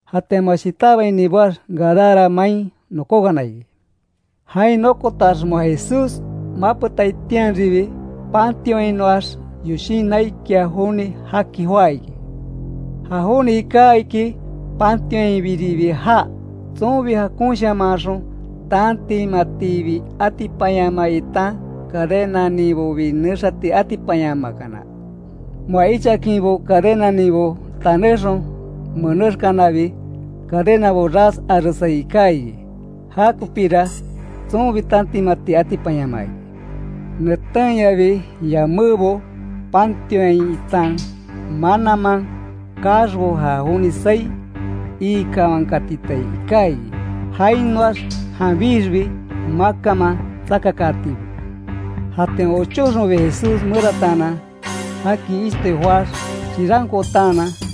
Jatian moa shitábaini boax, Gadara main nokókana iki. Jain nokotax moa Jesús mapetaitianribi, pantionhainoax yoshin naikia joni jaki joá iki. Ja joni iká iki pantionhainbiribi jaa; tsonbi jakonshamanxon tantimatibi atipanyamaa itan cadenaninbobi nexati atipanyamakana. Moa ichaakinbo cadenaninbo tanéxon menéxkanabi, cadenabo ras aresai iká iki. Jakopíra tsonbi tantimati atipanyamaa iki. Netenyabi, yamébo pantionhain itan mananman kaaxbo ja joni saí iikawankatitai iká iki. Jainoax janbixbi makanman tsakakaatibo. Jatian ochóxonbi Jesús merataanan jaki ishtoi joáx chirankootanan,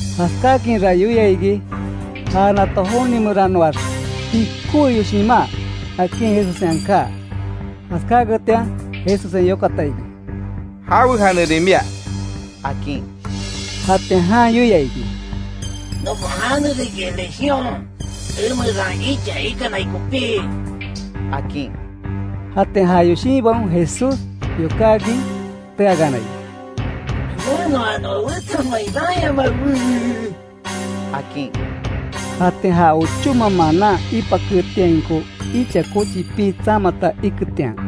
Jaskáakinra yoia iki, ja nato jonimeranoax pikówe yoshimá, akin Jesussen aká. Jaskáketian Jesussen yokata iki: —¿Jawe janerin mia? —akin. Jatian jan yoia iki: —Nokon jane riki legión, emeran icha ikanai kopí —akin. Jatian ja yoshinbaon Jesús yokákin teakana iki: —Nenoa noa wetsa main raanyamawe —akin. Jatian ja ochóma manan ipaketiainko icha kochi pii tsamata iketian,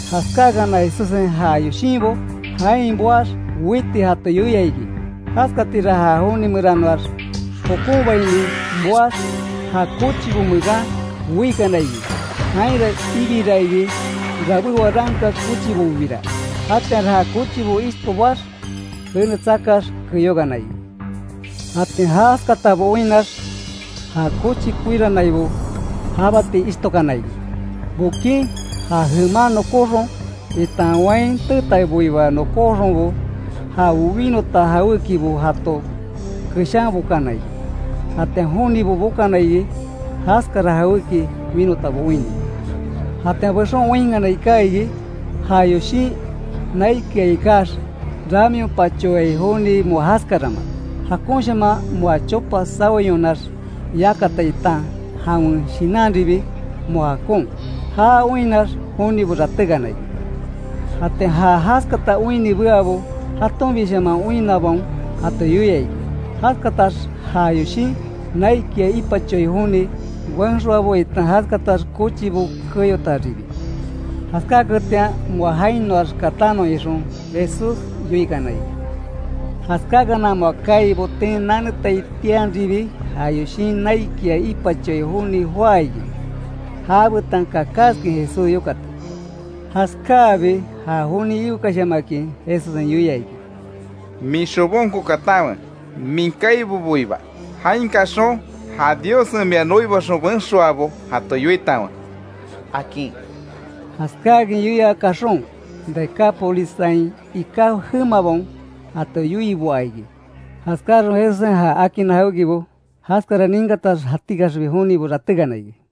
Jaskáakana Jesussen ja yoshinbo jain boax weiti jato yoia iki. Jaskatira ja joni meranoax jokonbaini boax ja kochibo meran weikana iki. Jainra ibiraa iki, rabé waranka kochibobira. Jatianra ja kochibo ishto boax, jene tsakax keyókana iki. Jatian jaskatabo oinnax, ja kochi koiranaibo jabati ishtokana iki, bokin ja jeman nokóxon itan wain teetaiboiba nokóxonbo, ja winota jawékibo jato keshanbokana iki. Jatian jonibo bokana iki, jaskara jawéki winotabo oinni. Jatian bexon oinkana iká iki, ja yoshin naikia ikax ramionpachoai joni, moa jaskarama; jakonshaman moa chopa saweyonax yakata itan jawen shinanribi moa jakon. Já oinnax jonibo ratékana iki. Jatian ja jaskata oinni beabo, jatonbishaman oinnabaon jato yoia iki; jaskatax ja yoshin naikia ipachoai joni benxoabo itan jaskatax kochibo keyotaribi. Jaskáaketian moa jainoax katanon ixon Jesús yoikana iki. Jaskáakana moa kaai boten nanetaitianribi, ja yoshin naikia ipachoai joni joá iki, jabetan kakaskin Jesús yokati. Jaskáabi ja joni iwekashamakin, Jesussen yoia iki: —Min xobonko katanwe, min kaiboboiba. Jain kaxon ja Diossen mia noibaxon benxoabo jato yoitanwe —akin. Jaskáakin yoia kaxon, Decápolissain iká jemabaon jato yoiboa iki; jaskáxon Jesussen já akinna jawékibo. Jaskara ninkatax jatikaxbi jonibo ratékana iki.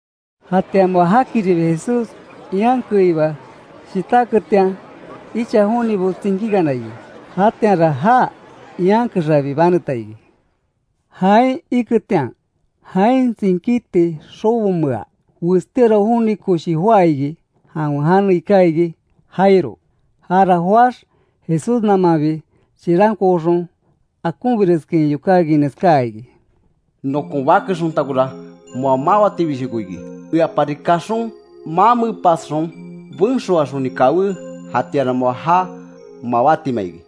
Jatian moa jakiribi Jesús ian keiba shitáketian, icha jonibo tsinkíkana iki. Jatianra já ian kexabi baneta iki. Jain iketian, jain tsinkíti xobomea westíora joni koshi joá iki; jawen jane iká iki Jairo. Jara joáx Jesús namanbi chirankooxon, akonbireskin yokákin neskáa iki: —Nokon bake xontakora moa mawatibishoko iki. Eapari kaxon mamepasxon benxoaxoni kawé, jatianra moa já mawátima iki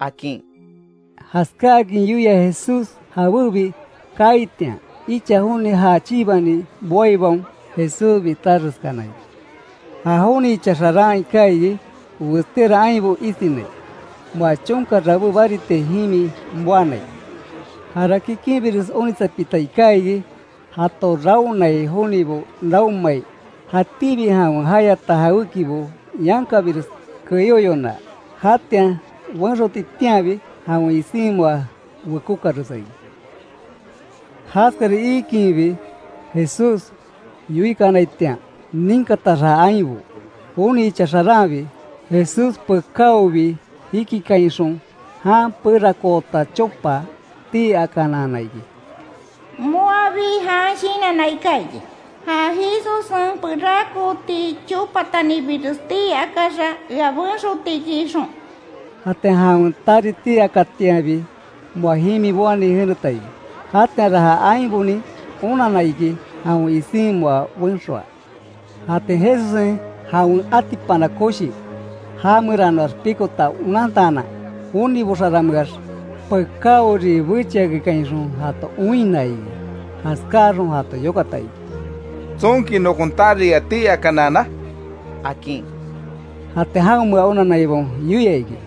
—akin. Jaskáakin yoia Jesús jabébi kaaitian, icha joni ja chibani boaibaon Jesús bitáxeskana iki. Ja joni icha xaran iká iki, westíora ainbo isinai; moa chonka rabé baritia jimi boanai. Jara kikinbiresi onitsapita iká iki jato raonai jonibo raonmai, jatíbi jawen jayata jawékibo yankabires keyoyona, jatian benxotitianbi, jawen isin moa wekókaresa iki. Jaskara iikinbi, Jesús yoikanaitian ninkatax ja ainbo, joni icha xaranbi, Jesús pekáobi jikikainxon jan perakoota chopa tii akanaana iki. Moabi jan shinanna iká iki, ja Jesussen perakooti chopatanibires tii akáxa ea benxoti iki ixon. Jatian jawen tari tii akatianbi, moa jimi boani jeneta iki. Jatianra ja ainbonin onanna iki, jawen isin moa benxoa. Jatian Jesussen jawen atipana koshi ja meranoax pikota onantaanan, jonibo xarameax pekáori bechiakekainxon jato oinna iki. Jaskáaxon jato yokata iki: —¿Tsonki nokon tari ea tii akanaana? —akin. Jatian jaonmea onanaibaon yoia iki: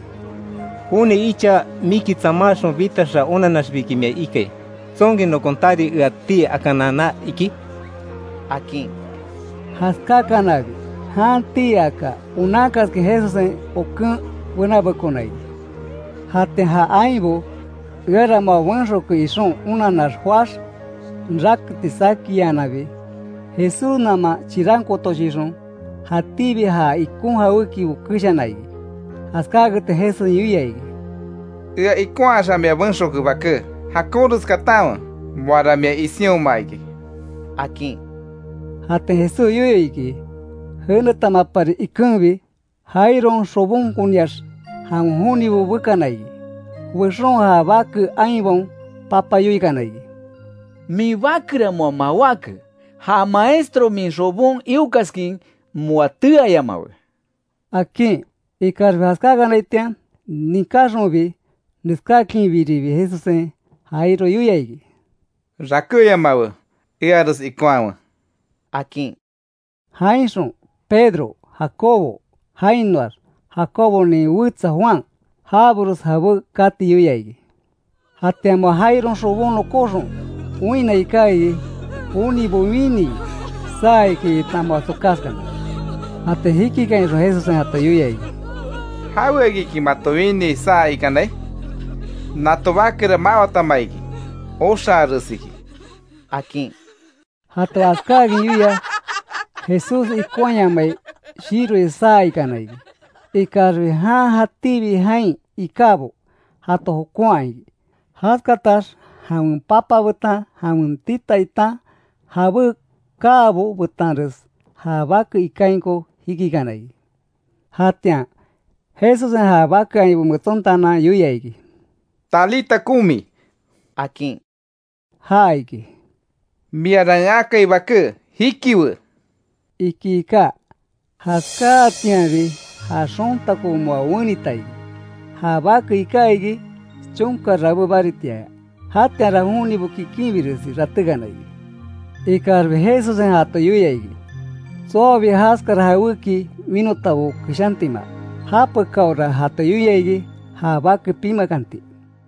—Joni icha miki tsamáxon bitaxa onanaxbiki mia ikai ¿Tsonki nokon tari ea tii akanaana iki? —akin. Jaskáakanabi jan tii aka onankaskin Jesussen oken benabekona iki. Jatian ja ainbo, eara moa benxoke ixon onanax joáx, raketi saki iananbi, Jesús naman chirankootoshixon, jatíbi ja ikon jawékibo keshana iki. Jaskáaketian Jesussen yoia iki: —Ea ikonhaxa mia benxoke, baké; jakonres katanwe, moara mia isinhoma iki —akin. Jatian Jesús yoyo iki jenetamapari ikenbi, Jairon xobonkoniax, jawen jonibo bekana iki. Bexon ja bake ainbaon papa yoikana iki: —Min bakera moa mawáke. Ja Maestro min xobon iokaskin moa teayamawe —akin. Ikaxbi jaskákanaitian ninkáxonbi, neskáakinbiribi Jesussen, Jairo yoia iki: —Rakéyamawe, eares ikonhawe —akin. Jainxon Pedro, Jacobo, jainoax Jacobonin wetsa Juan, jabores jabé kati yoia iki. Jatian moa Jairon xobon nokóxon oinna iká iki, jonibo winii, saa iki itan moa tsokaskana. Jatian jikikainxon Jesussen jato yoia iki: —¿Jaweakiki mato winii saa ikanai? Nato bakera mawatama iki. Oxaaresiki —akin. Jato jaskákin yoia, Jesús ikonhaayamai shiroi saa ikana iki. Ikaxbi jan jatíbi jain ikábo jato jokonha iki, jaskatax jawen papa betan jawen tita itan jabé kaabo betanres, ja bake ikainko jikikana iki. Jatian, Jesussen ja bake ainbo metsontaanan yoia iki: —¡Talita Cumi! —akin. Ja iki, “miara en akai baké, jikiwe”, iki iká. Jaskáatianbi, ja xontako moa wenita iki. Ja bake iká iki, chonka rabé baritiaya. Jatianra jonibo kikinbiresi ratékana iki. Ikaxbi Jesussen jato yoia iki, tsoabi jaskara jawéki winotabo keshantima. Japekáora jato yoia iki, ja bake pimakanti.